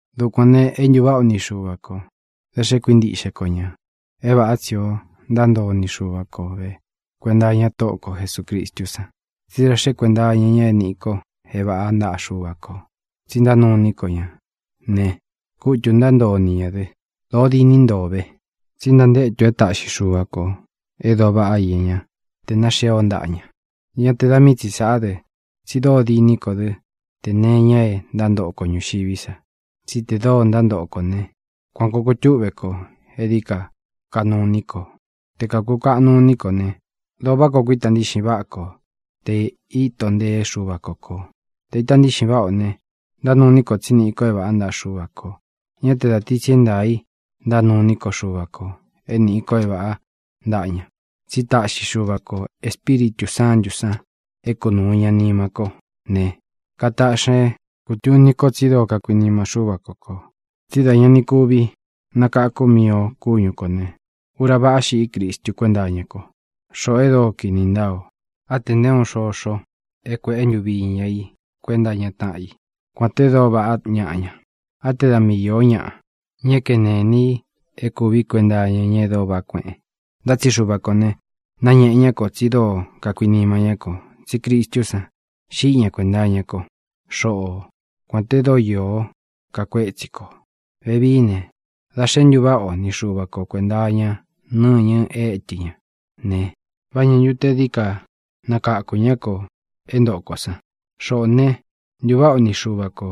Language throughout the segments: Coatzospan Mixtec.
Dukuān ne, é ntuváꞌa o ni Xuva kō, da xe kuíntiꞌxe ko ñā. E váꞌa tsi ō ntántoo o ni Xuva ko ve kuēnta iña Tóꞌo ko Jesūcristú san. Tsí da xé kuenta iña ña é nīꞌi ko é vāꞌá ntaꞌa Xuva kō, tsi ntánuu iní ko ñā. Ne, kutu ntántoo o ni ñā dɨ. Dōo diní ntoo ō ve, tsí ntantétu ō é taꞌxi Xuva kō e dóo vaꞌá iña ñá tē náxee o ntáꞌa ña. Ñá te da mii tsi sāꞌá dɨ, tsi dóo diní kō dɨ́ tē nee iña e ntántoꞌo ko ñūxiví sa. Tsí te dóo ntántoꞌo kō né, kuan kōo kutúꞌve ko é dií ka kukaꞌnu iní kō. Te kūkaꞌnu iní kō né, dōo vaꞌá koo kuita ntiꞌxin váꞌa ko tē íto nteé Xuva ko kō. Te ītá ntiꞌxin váꞌa o ne, ntánuu iní ko tsí niꞌi ko é vāꞌá ntaꞌa Xuva kō. Ñá te da ti tsi é ntaā i e ntánuu iní ko Xuva kō é nīꞌi ko é vāꞌá ntaꞌa ña, tsi táꞌxi Xuva kō Espíritū Sántū san, é kunūu ña nima kó ne, kataꞌxi ña é kūtuni ko tsi dóo kakuinima Xúva ko kō. Tsi dá ña ni kuvi nakakú mii ō kúñu kō ne, ura vaꞌá xiꞌí Cristu kuénta iña ko, xoꞌō e dóo kīni ntáa ō. Á tē nté uun xoxo é kuēꞌé ntuvi iña i kuénta iña táꞌan i, kuān te dóo vaꞌá ñaꞌa ña. Á te dā míi īo ñáꞌa, ña é kenē ini i é kūvi kuenta iña ña e dóo vaꞌá kueꞌen. Ntá tsi Xuva kō ne, náñēꞌe ñá kō tsi dóo kakuinima ñá ko, tsí Cristú san xiꞌi ñá kuenta iña kó xoꞌo, kuān te dóo īó ka kuétsi kō. Vevií ne, da xe é ntuváꞌa o ni Xuva ko kuēnta iña nɨ́ñɨ e étɨ ña ne, ¿vá ñā ntu te dií ka nakakū ñá ko é ntoꞌo kō san? Xoꞌō ne, ntuváꞌa o ni Xuva kō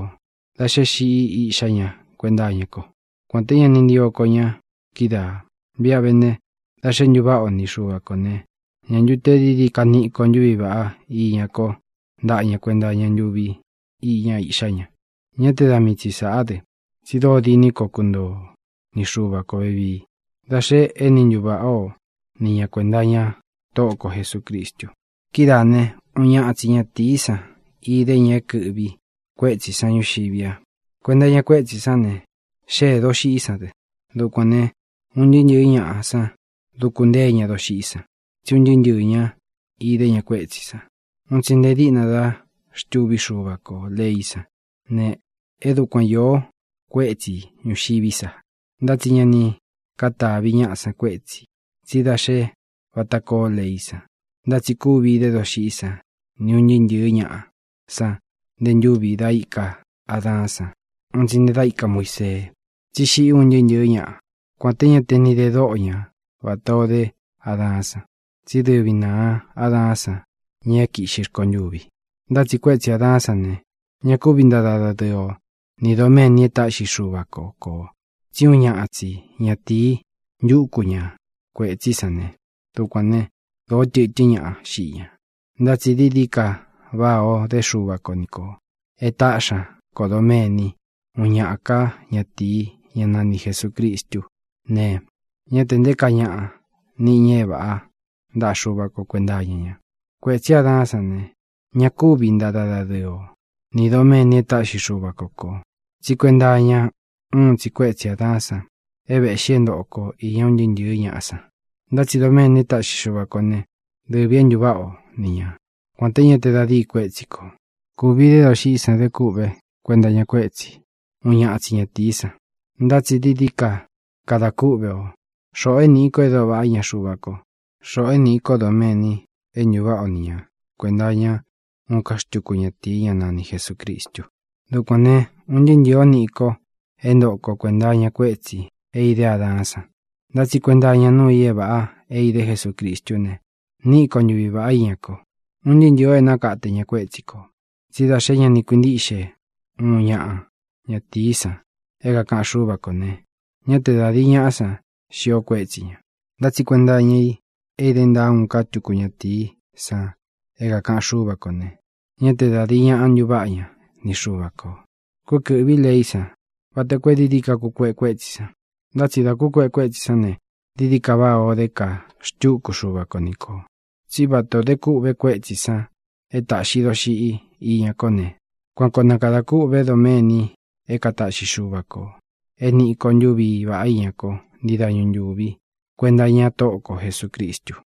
da xé xiꞌí Iꞌxá ña kuenta iña kó, kuān té ña ni ntío ko ña kídaā. Viꞌa vé ne, da xe é ntuváꞌa o ni Xuva kō né, ¿ñā ntu te dií dií ka niꞌi ko ntuví vaꞌá iña kó ntaꞌa ña kuenta iña ntuvi íña Iꞌxá ña? Ñá te da mii tsi sāꞌá dɨ, tsí dóo diní ko kuntoo o ni Xuva kō vevii, da xe é ntuváꞌa o ni ña kuēnta iña Tóꞌo ko Jesūcristu. Kidáā ne, uun ñaꞌa tsi ñatīí san idé ña é kɨ̄ꞌví kuétsī san ñúxiví a. Kuenta iña kuétsī sán ne, xée doxiꞌí san dɨ. Dukuān ne, un ntɨɨ́ ntɨ̄ɨ́ ñaꞌa san duku ntée ña doxiꞌí san, tsí un ntɨɨ́ ntɨɨ̄ ñá idé ña kuétsī san. Un tsi nte díꞌna dá xtūví Xuva kō leí san ne, é dukuan īo kuétsī ñuxiví sa. Ntá tsi ña ni kátāví ñaꞌa san kuétsī, tsí da xé vata koó leí san. Ntá tsi kuvi idé doxiꞌí san ni ūn ntɨɨ́ ntɨ̄ɨ́ ñaꞌa san nte ntúvi da íka Ādaán san un tsi nte da íka Muisee. Tsí xiꞌi un ntɨɨ́ ntɨ̄ɨ́ ñaꞌa, kuān té ña te ni de dóꞌo ña vatā o dé Adaán san. Tsí dɨvi nāa Adaán san ña é kīꞌxi rkontuvi. Ntá tsi kuétsi Ādaán san ne, ña kúvi ntada dadɨɨ o nī doméni e táꞌxi Xuva ko kō. Tsí uun ñaꞌa tsi ñatīi ntúku ña kuétsī sán ne, dukuān né, dōo tɨtɨ́n ñaꞌa xiꞌi ña. Ntá tsi dií dií ka váꞌā o dé Xuva ko ni kō e táꞌxi ña kō doméni uun ñaꞌa ká ñatīi, ñá nani Jesūcristú ne, ñá te nté kaa ñaꞌa niꞌi ña é vāꞌá ntaꞌa Xuva ko kuēnta iña ña. Kuétsi Ādaán san ne, ña kúvi ntada dadɨɨ o nī doméni e táꞌxi Xuva ko kō. Tsí kuenta iña úun tsi kuétsi Ādaán san é vēꞌxi é ntoꞌo ko īña un ntɨɨ́ ntɨ̄ɨ́ ñaꞌa san. Ntá tsi doméni e táꞌxi Xuva kō né, dɨvī é ntuváꞌa o ni ña, kuān té ña te da díi kuétsi kō. Kūvi idé doxiꞌí san dé kûꞌvé kuenta iña kuétsi uun ñaꞌa tsi ñatīí san, ntá tsi dií dií ka kada kúꞌvē ó, xoꞌō é nīꞌi ko e dóo vaꞌá iña Xuva kó, xoꞌō é nīꞌi ko doméni é ntuváꞌa o ni ña kuēnta iña úun ká xtuku ñatīi, ñá nani Jesūcristu. Dukuān ne, un ntɨɨ́ ntɨ̄ɨ o níꞌi ko é ntoꞌo ko kuēnta iña kuétsī é idé Adaán san. Ntá tsi kuenta iña núu i é vāꞌa é idé Jesucristú ne, níꞌi ko ntuvi vāꞌá iña ko, un ntɨɨ́ ntɨ̄ɨ o é nākate ña kuétsi kō. Tsí da xé ña ni kuintíꞌxe uun ñaꞌa ñatīí san é kākaꞌan Xúva kō ne, ñá te da dīi ñaꞌá san xio kuétsi ñā. Ntá tsi kuenta iña i é idé ntaa úun ká tuku ñatīí san é kākaꞌan Xúva kō ne, ñá te da dīi ñaꞌa ntuváꞌa ña ni Xuva kō. Kúkɨ̄ꞌví leí san vata koo é dií dií ka kukueꞌe kuétsī san. Ntá tsi dā kúkueꞌe kuétsī sán ne, dií dií ka váꞌā o dé ka xtúku Xúva ko ni kō. Tsí vatā o dé kûꞌve kuétsī san e táꞌxi doxiꞌi íña kó ne, kuan koo na kāda kûꞌvé doméni é kataꞌxi Xuva kō, é nīꞌi ko ntuví vaꞌá iña ko ntii dañu ntúvi kuenta iña Tóꞌo ko Jesūcristu.